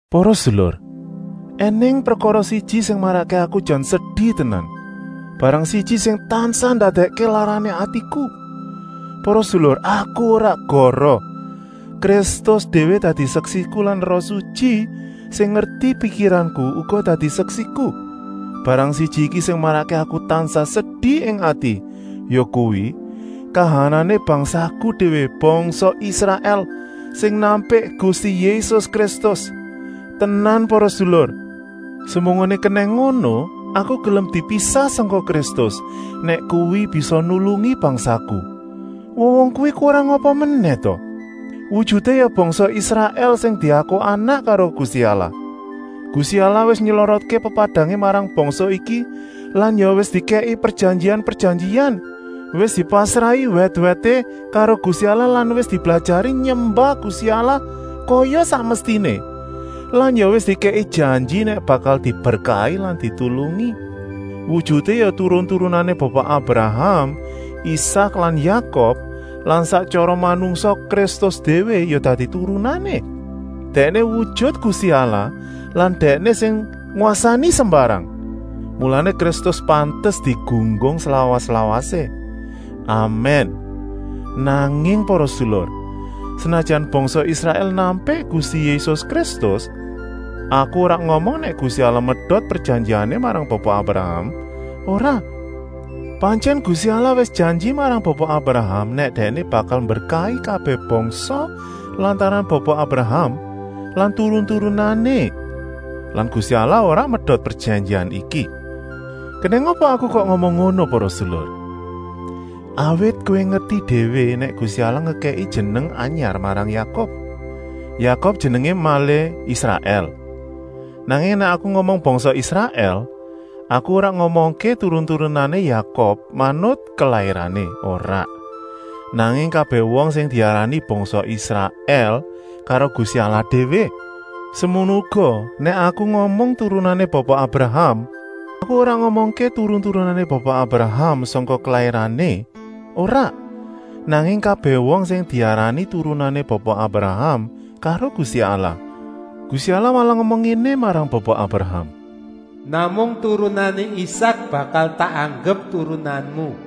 Para sedulur, ènèng prekara siji sing marakké aku jan sedi tenan, barang siji sing tansah ndadèkké larané atiku. Para sedulur, aku ora goroh! Kristus déwé dadi seksiku lan Roh Sutyi, sing ngerti pikiranku, uga dadi seksiku. Barang siji iki sing marakké aku tansah sedi ing ati, yakuwi, kahanané bangsaku déwé, bangsa Israèl, sing nampik Gusti Yésus Kristus. Tenan para sedulur, semunggoné kenèng ngono aku gelem dipisah sangka Kristus, nèk kuwi bisa nulungi bangsaku. Wong-wong kuwi kurang apa menèh ta? Wujuté ya bangsa Israèl sing diaku anak karo Gusti Allah. Gusti Allah wis nylorotké pepadangé marang bangsa iki lan ya wis dikèki prejanjian-prejanjian. Wis dipasrahi wèt-wèté karo Gusti Allah lan wis diblajari nyembah Gusti Allah kaya sak mestiné lan ya wis dikèki janji nèk bakal diberkahi lan ditulungi. Wujuté ya turun-turunané Bapa Abraham, Isak lan Yakub lan sak tyara manungsa Kristus déwé ya dadi turunané. Dèkné wujut Gusti Allah lan Dèkné sing ngwasani sembarang. Mulané Kristus pantes digunggung slawas-lawasé. Amèn. Nanging para sedulur, senajan bangsa Israèl nampik Gusti Yésus Kristus, aku ora ngomong nèk Gusti Allah medot prejanjiané marang Bapa Abraham, ora. Pantyèn Gusti Allah wis janji marang Bapa Abraham nèk Dèkné bakal mberkahi kabèh bangsa lantaran Bapa Abraham lan turun-turunané lan Gusti Allah ora medot prejanjian iki. Kenèng apa aku kok ngomong ngono para sedulur? Awit kowé ngerti déwé nèk Gusti Allah ngekèki jeneng anyar marang Yakub. Yakub jenengé malih Israèl. Nanging nèk aku ngomong bangsa Israèl, aku ora ngomongké turun-turunané Yakub manut kelairané, ora, nanging kabèh wong sing diarani bangsa Israèl karo Gusti Allah déwé. Semono uga nèk aku ngomong turunané Bapa Abraham, aku ora ngomongké turun-turunané Bapa Abraham sangka kelairané, ora, nanging kabèh wong sing diarani turunané Bapa Abraham karo Gusti Allah. Gusti Allah malah ngomong ngéné marang Bapa Abraham: “Namung turunané Isak bakal tak anggep turunanmu.”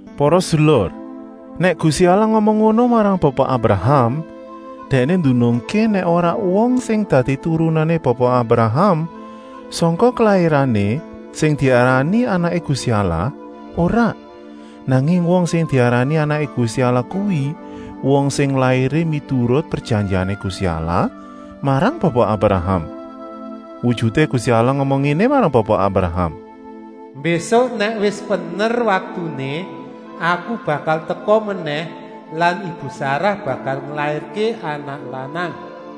Para sedulur, nèk Gusti Allah ngomong ngono marang Bapa Abraham, Dèkné ndunungké nèk ora wong sing dadi turunané Bapa Abraham sangka kelairané sing diarani anaké Gusti Allah, ora, nanging wong sing diarani anaké Gusti Allah kuwi wong sing lairé miturut prejanjiané Gusti Allah marang Bapa Abraham. Wujuté Gusti Allah ngomong ngéné marang Bapa Abraham: “Mbésuk nèk wis pener waktuné, Aku bakal teka menèh lan ibu Sarah bakal nglairké anak lanang.”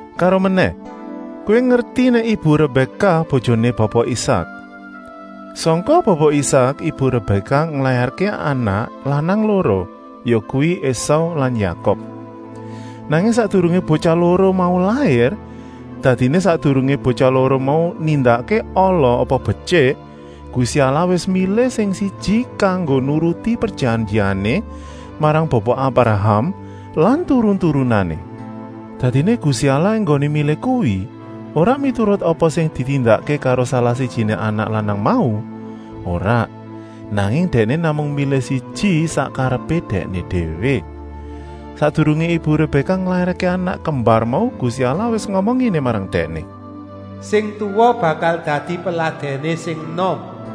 Karomenèh, kowé ngerti nèk ibu Rebèkah bojoné Bapa Isak. Sangka Bapa Isak ibu Rebèkah nglairké anak lanang loro, yakuwi Esau lan Yakub. Nanging sakdurungé botyah loro mau lair, dadiné sakdurungé botyah loro mau nindakké ala apa betyik, Gusti Allah wis milih sing siji kanggo nuruti prejanjiané marang Bapa Abraham lan turun-turunané. Dadiné Gusti Allah enggoné milih kuwi ora miturut apa sing ditindakké karo salah-sijiné anak lanang mau, ora, nanging Dèkné namung milih siji sak karepé Dèkné déwé. Sakdurungé ibu Rebèkah nglairké anak kembar mau Gusti Allah wis ngomong ngéné marang dèkné: “Sing tuwa bakal dadi peladèné sing enom!”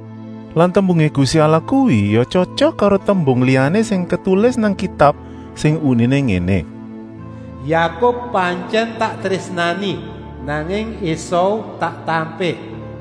Lan tembungé Gusti Allah kuwi ya tyotyok karo tembung liyané sing ketulis nang Kitab sing uniné ngéné: “Yakub pantyèn tak trésnani, nanging Esau tak tampik.”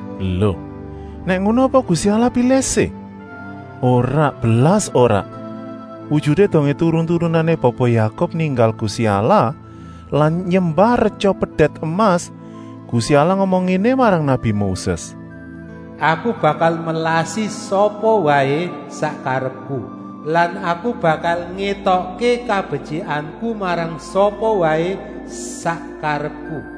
Lo, nèk ngono apa Gusti Allah pilih-sih? Ora, blas ora! Wujuté dongé turun-turunané Bapa Yakub ninggal Gusti Allah lan nyembah retya pedèt emas, Gusti Allah ngomong ngéné marang nabi Moses: “Aku bakal melasi sapa waé sak karepku lan Aku bakal ngétokké kabetyikanku marang sapa waé sak karepku!”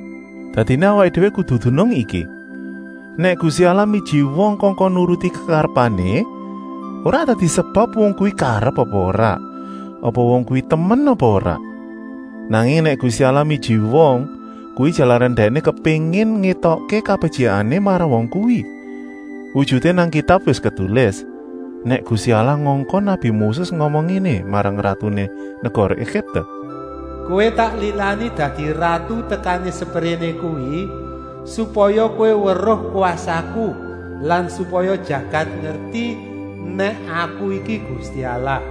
Dadiné awaké déwé kudu dunung iki: nèk Gusti Allah miji wong kongkon nuruti kekarepané, ora dadi sebab wong kuwi karep apa ora, apa wong kuwi temen apa ora. Nanging nèk Gusti Allah miji wong, kuwi jalaran Dèkné kepéngin ngétokké kabetyikané marang wong kuwi. Wujuté nang Kitab wis ketulis, nèk Gusti Allah ngongkon nabi Moses ngomong ngéné marang ratuné negara Egipte: “Kowé tak lilani dadi ratu tekané sepréné kuwi, supaya kowé weruh kwasaku lan supaya jagat ngerti nèk Aku iki Gusti Allah.”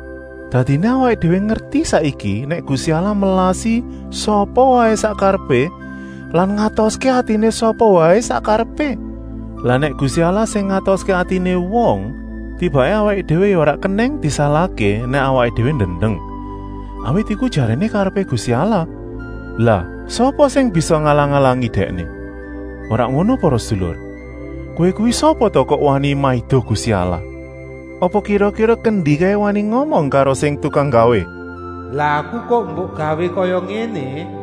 Dadiné awaké déwé ngerti saiki nèk Gusti Allah melasi sapa waé sak karepé lan ngatoské atiné sapa waé sak karepé. Lah nèk Gusti Allah sing ngatoské atiné wong, tibaké awaké déwé ya ora kenèng disalahké nèk awaké déwé ndendeng, awit iku jaréné karepé Gusti Allah. Lah sapa sing bisa ngalang-alangi Dèkné? Ora ngono para sedulur, kowé kuwi sapa ta kok wani maido Gusti Allah? Apa kira-kira kendi kaé wani ngomong karo sing tukang nggawé: “Lah aku kok mbok gawé kaya ngéné?”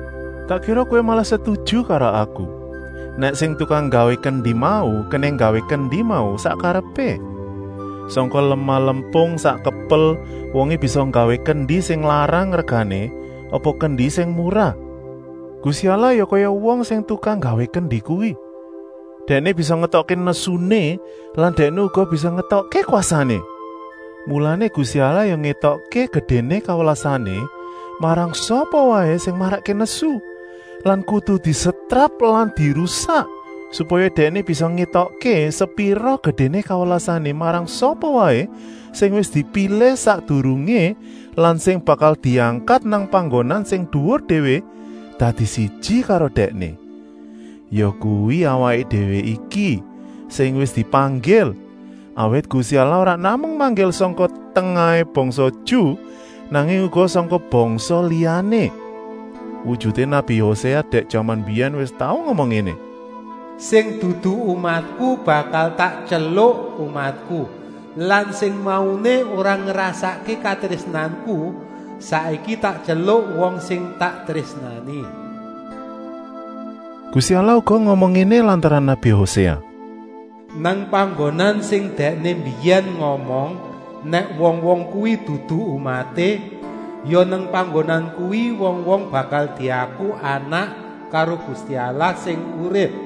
Tak kira kowé malah setuju karo aku, nèk sing tukang nggawé kendi mau kenèng nggawé kendi mau sak karepé. Sangka lemah lempung sak kepel wongé bisa nggawé kendi sing larang regané apa kendi sing murah. Gusti Allah ya kaya wong sing tukang nggawé kendi kuwi. Dèkné bisa ngétokké nesuné lan Dèkné uga bisa ngétokké kwasané. Mulané Gusti Allah ya ngétokké gedéné kawelasané marang sapa waé sing marakké nesu lan kudu disetrap lan dirusak, supaya Dèkné bisa ngétokké sepira gedéné kawelasané marang sapa waé sing wis dipilih sakdurungé lan sing bakal diangkat nang panggonan sing duwur déwé, dadi siji karo Dèkné. Yakuwi awaké déwé iki, sing wis dipanggil, awit Gusti Allah ora namung manggil sangka tengahé bangsa Ju, nanging uga sangka bangsa liyané. Wujuté nabi Hoséa dèk jaman mbiyèn wis tau ngomong ngéné: “Sing dudu umatku bakal tak tyeluk umatku lan sing mauné ora ngrasakké katrésnanku saiki tak tyeluk wong sing tak trésnani.” Gusti Allah uga ngomong ngéné lantaran nabi Hoséa: “Nang panggonan sing Dèkné mbiyèn ngomong nèk wong-wong kuwi dudu umaté, ya nang panggonan kuwi wong-wong bakal diaku anak karo Gusti Allah sing urip.”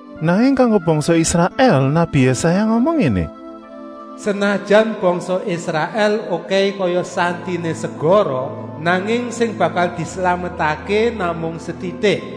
Nanging kanggo bangsa Israèl nabi Yésaya ngomong ngéné: “Senajan bangsa Israèl okèhé kaya santiné segara, nanging sing bakal dislametké namung setitik.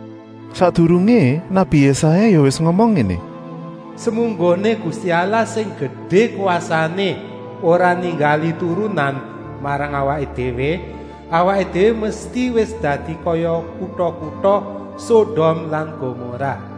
Sakdurungé nabi Yésaya ya wis ngomong ngéné: “Semunggoné Gusti Allah sing gedé kwasané ora ninggali turunan marang awaké déwé, awaké déwé mesti wis dadi kaya kuta-kuta Sodom lan Gomorah.”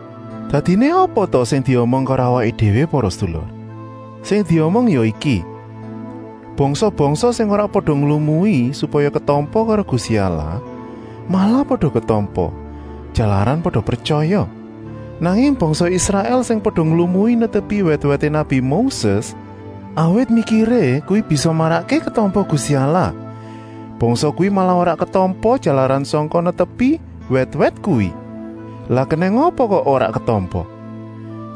Dadiné apa ta sing diomong karo awaké déwé para sedulur? Sing diomong ya iki: bangsa-bangsa sing ora pada nglumui supaya ketampa karo Gusti Allah malah pada ketampa, jalaran pada pretyaya. Nanging bangsa Israèl sing pada nglumui netepi wèt-wèté nabi Moses, awit mikiré kuwi bisa marakké ketampa Gusti Allah, bangsa kuwi malah ora ketampa jalaran sangka netepi wèt-wèt kuwi. Lah kenèng apa kok ora ketampa?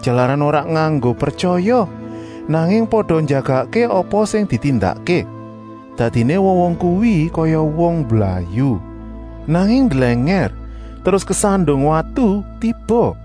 Jalaran ora nganggo pretyaya, nanging pada njagakké apa sing ditindakké. Dadiné wong-wong kuwi kaya wong mblayu, nanging ndlèngèr, terus kesandung watu tiba.